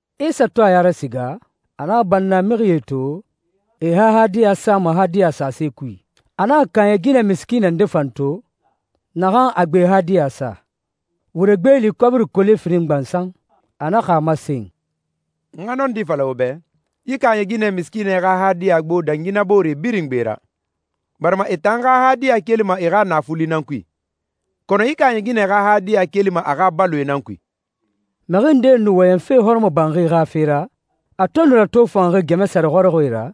Isa to a ya rasiga, a naxa bannamixie to, e e xa hadiya sama hadiya a sase kui. A naxa kaaɲɛ ginɛ misikiinɛ nde fan to, naxan a gbe hadiya sa, wure gbeeli kɔbiri kole firin gbansan. A naxa a masen, «N xa nɔndi fala wo bɛ, yi kaaɲɛ ginɛ misikiinɛ xa hadiya gbo dangi na boore birin gbe ra, barima e tan xa hadiya kelima e xa naafuli nan kui, kɔnɔ yi kaaɲɛ ginɛ xa hadiya kelima a xa baloe nan kui.» Mixi ndee nu wɔyɛnfe hɔrɔmɔbanxi xa fe ra, a to nu ratofanxi gɛmɛ sare xɔrɔxɔɛe ra,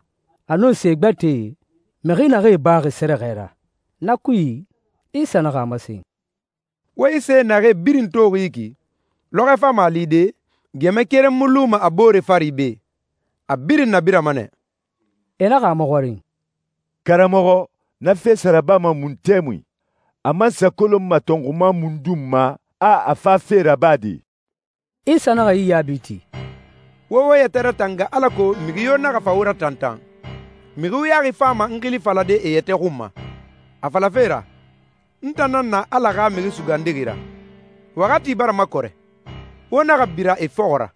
a nun se gbɛtɛe, mixi naxee baxi sɛrɛxɛ ra. Na kui, Isa naxa a masen, «Wo yi se naxee birin toxi yi ki, lɔxɔɛ fama a lide, gɛmɛ keren mu luma a boore fari be, a birin nabirama nɛ.» E naxa a maxɔrin, «Karamɔxɔ, na fe sa rabama mun tɛmui? A man sa kolonma tɔnxuma mundun ma a a fafe rabade?» Isa naxa yi yaabi ti, «Wo wo yɛtɛ ratanga alako mixi yo naxa fa wo ratantan. Mixi wuyaxi fama n xili falade e yɛtɛ xun ma, a falafe ra, ‹N tan nan na Ala xa Mixi Sugandixi ra. Waxati bara makɔrɛ.› Wo naxa bira e fɔxɔ ra.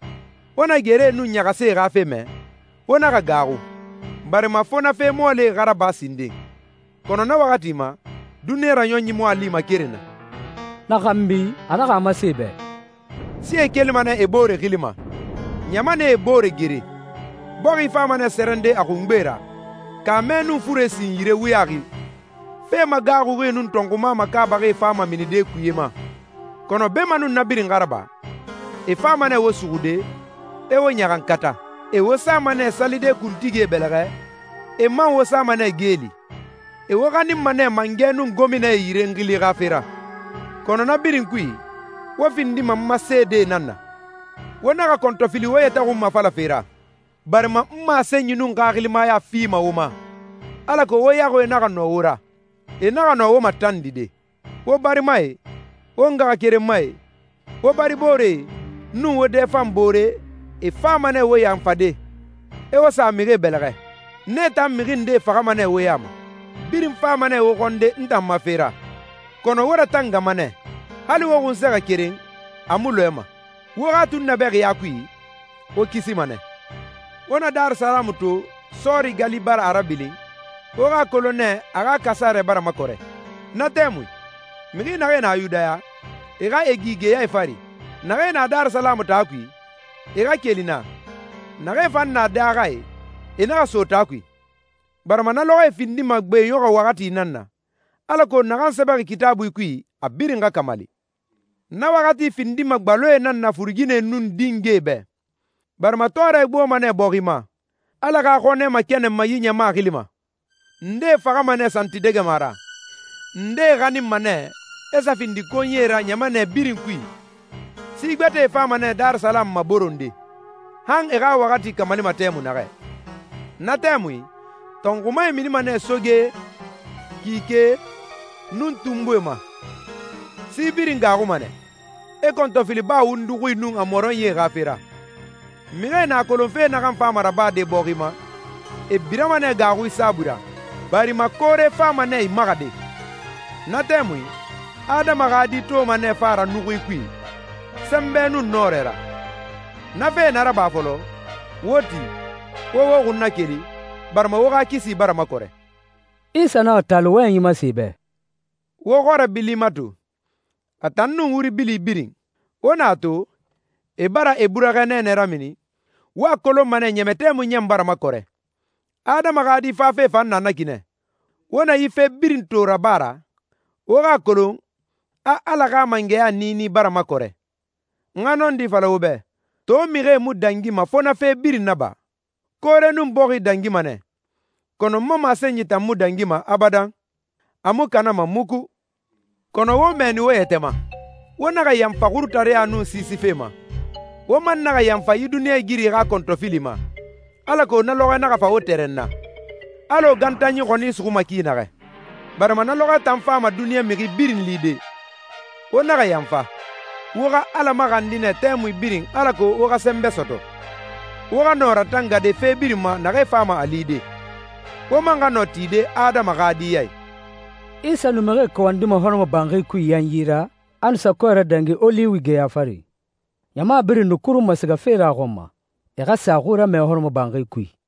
Wo na geree nun ɲaxasie xa fe mɛ, wo naxa gaaxu, barima fo na fe mɔɔlie xa raba sinden. Kɔnɔ na waxati ma, duniɲa raɲɔnyi mu a lima keren na.» Na xanbi, a naxa a masen e bɛ, «Sie kelima nɛ e boore xili ma, ɲamanɛe e boore gere. Bɔxi fama nɛ sɛrɛnde a xungbe ra, kaamɛ nun fure sin yire wuyaxi. Fe magaaxuxie nun tɔnxuma makaabaxie fama minide kuye ma.» «Kɔnɔ beemanun na birin xa raba, e fama nɛ wo suxude, e wo ɲaxankata. E wo sama nɛ salide kuntigie bɛlɛxɛ, e man wo sama nɛ geeli. E wo xaninma nɛ mangɛ nun gominae yire n xili xa fe ra. Kɔnɔ na birin kui, wo findima n ma seedee nan na. Wo naxa kɔntɔfili wo yɛtɛ xunmafalafe ra, barima n masenyi nun xaxilimaya fima wo ma, alako wo yaxuie naxa nɔ wo ra, e naxa nɔ wo matandide. Wo barimae, wo ngaxakerenmae, wo baribooree, nun wo dɛfanbooree, e fama nɛ wo yanfade, e wo sa mixie bɛlɛxɛ. Nee tan mixi ndee faxama nɛ wo ya ma. Birin fama nɛ wo xɔnde n tan ma fe ra, kɔnɔ wo ratangama nɛ. Hali wo xunsɛxɛ keren, a mu lɔɛma. Wo xa tunnabɛxiya kui, wo kisima nɛ.» «Wo na Darisalamu to, sɔɔri gali bara a rabilin, wo xa a kolon nɛ a a xa kasarɛ bara makɔrɛ. Na tɛmui, mixi naxee na Yudaya, e xa e gi geyae fari. Naxee na Darisalamu taa kui, e xa keli naa. Naxee fan na daaxae, e naxa so taa kui, barima na lɔxɔɛe findima gbeɲɔxɔ waxati nan na, alako naxan sɛbɛxi Kitaabui kui a birin xa kamali. Na waxati findima gbaloe nan na furuginɛe nun dingɛe bɛ! Barima tɔɔrɛ gboma nɛ bɔxi ma, Ala xa xɔnɛ makɛnɛnma yi ɲama xili ma. Ndee faxama nɛ santidɛgɛma ra, ndee xaninma nɛ, e sa findi konyie ra ɲamanɛ birin kui. Si gbɛtɛe fama nɛ Darisalamu maboronde, han e xa waxati kamalima tɛmui naxɛ.» «Na tɛmui, tɔnxumae minima nɛ soge, kike, nun tunbuie ma. Si birin gaaxuma nɛ, e kɔntɔfili baa wundu xui nun a mɔrɔnyie xa fe ra. Mixie na a kolon fe naxan fama rabade bɔxi ma, e birama nɛ gaaxui saabui ra, barima koore fama nɛ imaxade. Na tɛmui, Adama xa Di toma nɛ fa ra nuxui kui, sɛnbɛ nun nɔrɛ ra. Na fee na raba fɔlɔ, wo ti, wo wo xun nakeli, barima wo xa kisi bara makɔrɛ.» Isa naxa taali wɔyɛnyi masen e bɛ, «Wo xɔrɛ bili mato, a tan nun wuri bili birin. Wo na a to, e bara e burɛxɛ nɛɛnɛ ramini, wo a kolonma ɲɛmɛ tɛmui ɲan bara makɔrɛ. Adama xa Di fafe fan na na ki nɛ. Wo na yi fe birin to raba ra, wo xa a kolon a Ala xa mangɛya niini bara makɔrɛ. N xa nɔndi fala wo bɛ, to mixie mu dangima fo na fe birin naba. Koore nun bɔxi dangima nɛ, kɔnɔ n ma masenyi tan mu dangima abadan, a mu kanama muku.» «Kɔnɔ wo mɛɛni wo yɛtɛ ma! Wo naxa yanfa xurutareɲa nun siisife ma, wo man naxa yanfa yi duniɲɛigiri xa kɔntɔfili ma, alako na lɔxɔɛ naxa fa wo tɛrɛnna, alɔ gantanyi xɔni suxuma ki naxɛ. Barima na lɔxɔɛ tan fama duniɲa mixi birin lide. Wo naxa yanfa! Wo xa Ala maxandi nɛ tɛmui birin alako wo xa sɛnbɛ sɔtɔ, wo xa nɔ ratangade fe birin ma naxee fama a lide, wo man xa nɔ tide Adama xa Di ya i.» Isa nu mixie kawandima hɔrɔmɔbanxi kui yanyi ra, a nu sa kɔɛ radangi Oliwi geya fari. Ɲama birin nu kurunma sigafe ra a xɔn ma, e xa sa a xui ramɛ hɔrɔmɔbanxi kui.